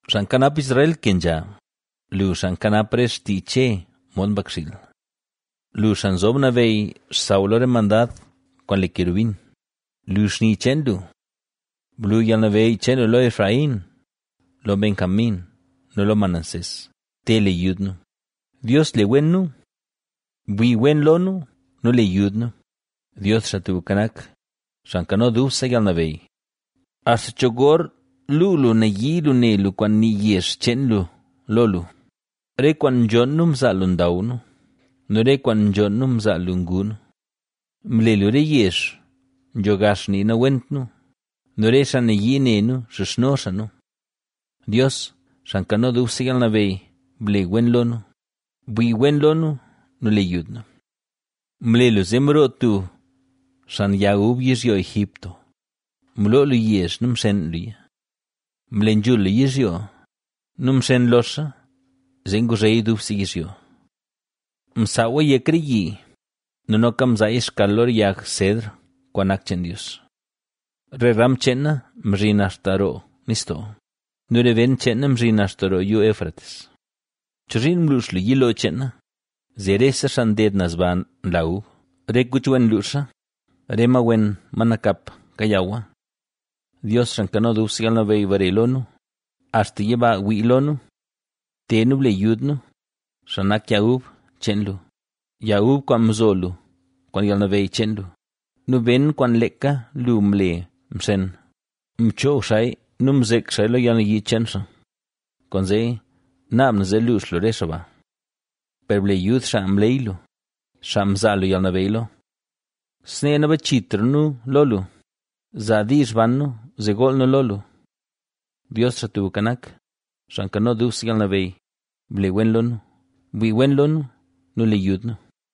Xaa nkanap Israel, ¡kenzha! Lu xaa nkanap re xtii Che mod mbakxiil. Lu, xaa nzob nabeyy xsaw lo re mandad kwaan le kerubin, lu xni cheen lu. ¡Blu yalnabeyy cheen lu lo Efraín, lo Benjamín nu lo Manasés! ¡Te le yud nu! Dios, le wen nu; bwii wen lo nu, nu le yud nu. Dios, Xaa Tubka Nak, Xaa Nkano Dubse Yalnabeyy, ¿Axta cho gor luu lu nayii lu ne lu kwaan nii yezh cheen lu lo lu? Re kwaan nzhonn nu mzaa lu ndaw nu nu re kwaan nzhonn nu mzaa lu ngu nu. Mle lu re yezh nzho gax nii nawent nu nu re xaa nayii ne nu nxizhno xaa nu. Dios, Xaa Nkano Dubse Yalnabeyy, ble wen lo nu, bwii wen lo nu, nu le yud nu. Mle lu zee mroo tub xan yag ub yizhyo Egipto; mloo lu yezh nu mxeen luya. Mle nzhul lu yizhyo, nu mxen loxa zee nguzheya dubse yizhyo. Msaawa yek re yi nu noka mzaaya xkal lo re yag sedr kwaan nak cheen Dios. Re ram cheena mzhin axta roo nistoo nu re ben cheena mzhin axta roo yuu Éufrates. ¿Chozhiin mluux lu yilo cheena, zee rese xaa nded naz ba nla ub? Re kuch wen nluuxa, re ma wen, ma nakap, kayawa. Dios Xaa Nkano Dubse Yalnabeyy bare lo nu, axta yiba wii lo nu. Te nu ble yud nu, xaa nak yag ub cheen lu, Yag ub kwaan mzo lu kwaan yalnabeyy cheen lu, nu ben kwaan leeka lu mle mxen. Mchoog xaaya nu mzek xaaya lo yalnayii cheen xaa, kwaanzee naab na zee luux lu re xaa ba. Per ble yud xaa mleyy lu, xaa mzaa lu yalnabeyy lo. Snee nabachitra nu lo lu; zaa diizh ban nu zee gool nu lo lu. Dios, Xaa Tubka Nak, Xaa Nkano Dubse Yalnabeyy, ble wen lo nu, bwii wen lo nu, nu le yud nu.